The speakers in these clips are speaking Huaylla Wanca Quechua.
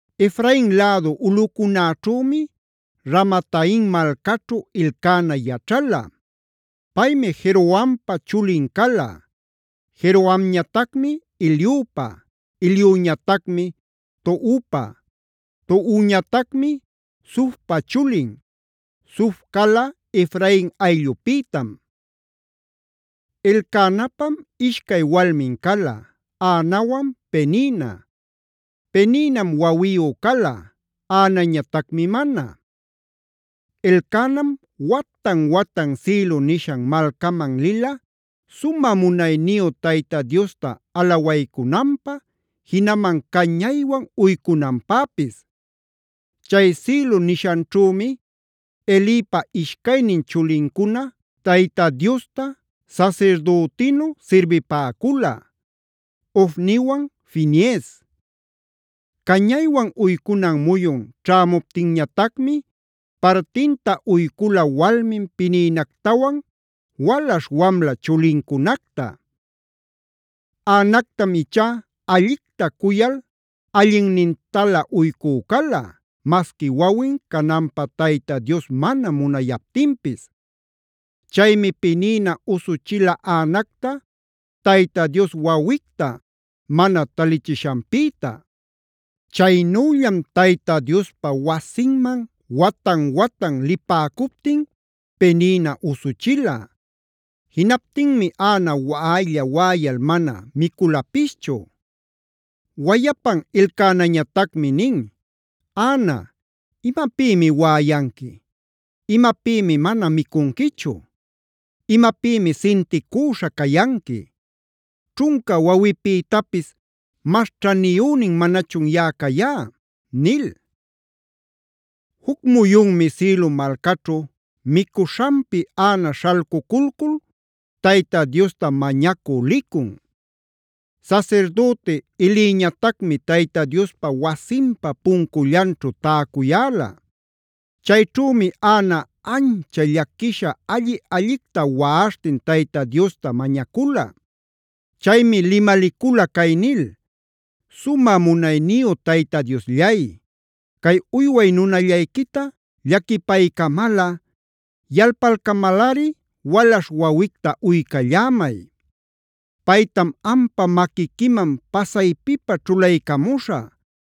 Efrain lädu ulꞌucunäćhümi Ramataim malcaćhu Elcana yaćhala. Paymi Jerohampa chulin cala; Jerohamñatacmi Eliupa, Eliuñatacmi Tohupa, Tohuñatacmi Zufpa chulin, Zuf cala Efrain ayllupïtam. Elcanapam ishcay walmin cala: Anawan Penina. Peninam wawiyu cala, Anañatacmi mana. Elcanam watan-watan Silo nishan malcaman lila sumä munayniyu Tayta Diosta alawaycunanpä, jinaman cañaywan uycunanpäpis. Chay Silo nishanćhümi Elipa ishcaynin chulincuna Tayta Diosta sasirdütinu sirbipäcula: Ofniwan Finees. Cañaywan uycunan muyun ćhämuptinñatacmi partinta uycula walmin Peninactawan walaśh-wamla chulincunacta. Anactam ichá allicta cuyal allinnintalä uycü cala, masqui wawin cananpä Tayta Dios mana munayaptinpis. Chaymi Penina usuchila Anacta Tayta Dios wawicta mana talichishanpïta. Chaynüllam Tayta Diospa wasinman watan-watan lipäcuptin Penina usuchila. Jinaptinmi Ana waꞌaylla-waꞌayal mana miculapischu. Wayapan Elcanañatacmi nin: “Ana, ¿imapïmi waꞌayanqui? ¿Imapïmi mana micunquichu? ¿Imapïmi sinticüśha cayanqui? ¿Ćhunca wawipïtapis mas ćhaniyünin manachun yaꞌa cayá?” nil. Juc muyunmi Silo malcaćhu micuśhanpi Ana śhalcuculcul Tayta Diosta mañacü licun. Sasirdüti Eliñatacmi Tayta Diospa wasinpa puncullanćhu täcuyäla. Chayćhümi Ana ancha llaquisha alli-allicta waꞌaśhtin Tayta Diosta mañacula. Chaymi limalicula cay nil: “Sumä munayniyu Tayta Diosllay, cay uyway nunallayquita llaquipaycamalꞌa, yalpalcamalꞌari walaśh wawicta uycallämay. Paytam ampa maquiquiman pasaypipä ćhulaycamuśhä,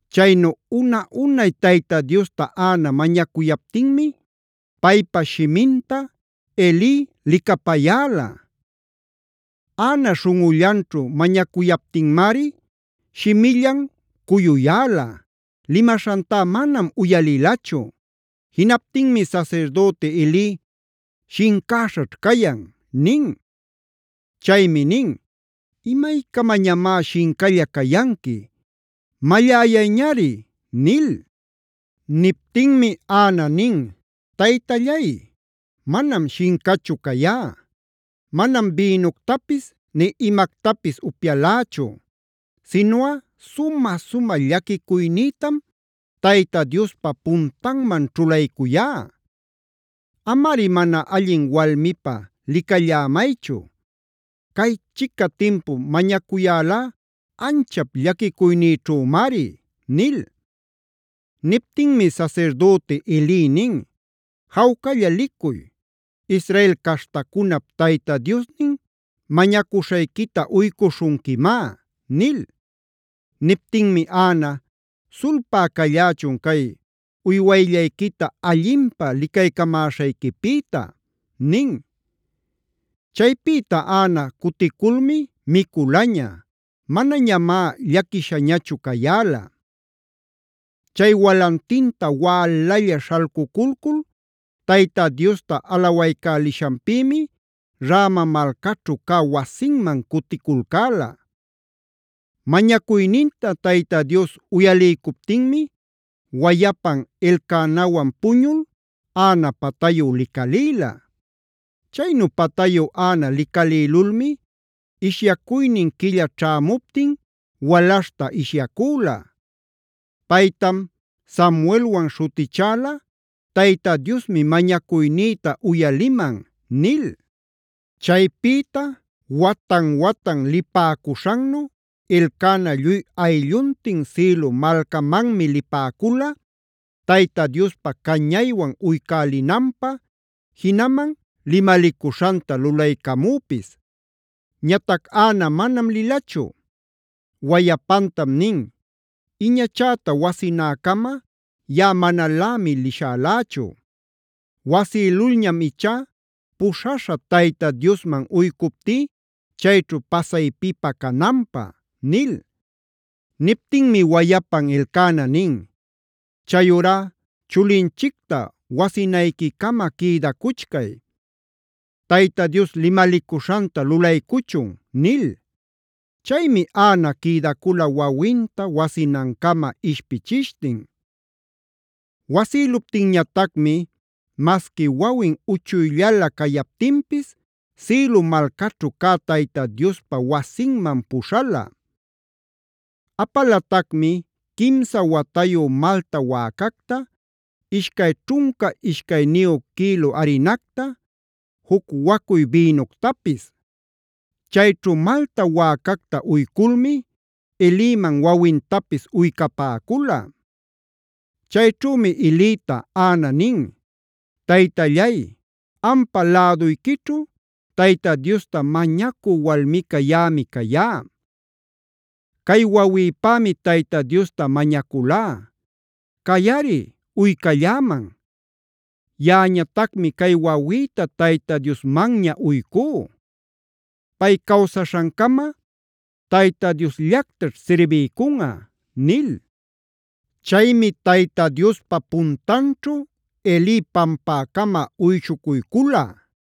Chaynu una-unay Tayta Diosta Ana mañacuyaptinmi paypa shiminta Eli licapayäla. Ana śhunꞌullanćhu mañacuyaptinmari shimillan cuyuyäla; limaśhantá manam uyalilachu. Jinaptinmi sasirdüti Eli: “Shincäśhaćh cayan” nin. Chaymi nin: “¿Imaycamañamá shincalla cayanqui? ¡Malläyayñari!” nil. Niptinmi Ana nin: “Taytallay, manam shincachu cayá. Manam bïnuctapis nï imactapis upyalächu. Sinuꞌa sumä-sumä llaquicuynïtam Tayta Diospa puntanman ćhulaycuyá. Amari mana allin walmipä licallämaychu. Caychica timpu mañacuyälá anchap llaquicuynïćhümari” nil. Niptinmi sasirdüti Eli nin: “Jawcalla licuy. Israel caśhtacunap Tayta Diosnin mañacuśhayquita uycuśhunquimá” nil. Niptinmi Ana: “Sulpä callächun cay uywayllayquita allinpä licaycamäśhayquipïta” nin. Chaypïta Ana cuticulmi miculaña. Manañamá llaquishañachu cayäla. Chay walantinta wälalla śhalcuculcul Tayta Diosta alawaycälishanpïmi Rama malcaćhu cä wasinman cuticulcäla. Mañacuyninta Tayta Dios uyaliycuptinmi wayapan Elcanawan puñul Ana patayu licalïla. Chaynu patayu Ana licalïlulmi ishyacuynin quilla ćhämuptin walaśhta ishyacüla. Paytam Samuelwanb śhutichäla: “Tayta Diosmi mañacuynïta uyaliman” nil. Chaypïta watan-watan lipäcuśhannu Elcana lluy aylluntin Silo malcamanmi lipäcula Tayta Diospa cañaywan uycälinanpä, jinaman limalicuśhanta lulaycamüpis. Ñatac Ana manam lilachu. Wayapantam nin: “Iñachäta wasinäcama yaꞌa manalämi lishälächu. Wasïlulñam ichá puśhaśhä Tayta Diosman uycuptí chayćhu pasaypipä cananpä” nil. Niptinmi wayapan Elcana nin: “Chayurá chulinchicta wasinayquicama quïdacuchcay; Tayta Dios limalicuśhanta lulaycuchun” nil. Chaymi Ana quïdacula wawinta wasinancama ishpichishtin. Wasïluptinñatacmi masqui wawin uchuyllala cayaptinpis Silo malcaćhu cä Tayta Diospa wasinman puśhala. Apalatacmi quimsa watayu malta wäcacta, ishcay ćhunca ishcayniyu quïlu arinacta, juc wacuy bïnuctapis. Chayćhu malta wäcacta uyculmi Eliman wawintapis uycapäcula. Chayćhümi Elita Ana nin: “Taytallay, ampa läduyquićhu Tayta Diosta mañacü walmica yaꞌami cayá. Cay wawïpämi Tayta Diosta mañaculá; cayꞌari uycalläman. Yaꞌañatacmi cay wawïta Tayta Diosmanña uycú; pay cawsaśhancama Tayta Diosllactaćh sirbiycunꞌa” nil. Chaymi Tayta Diospa puntanćhu Eli pampäcama uyshucuycula.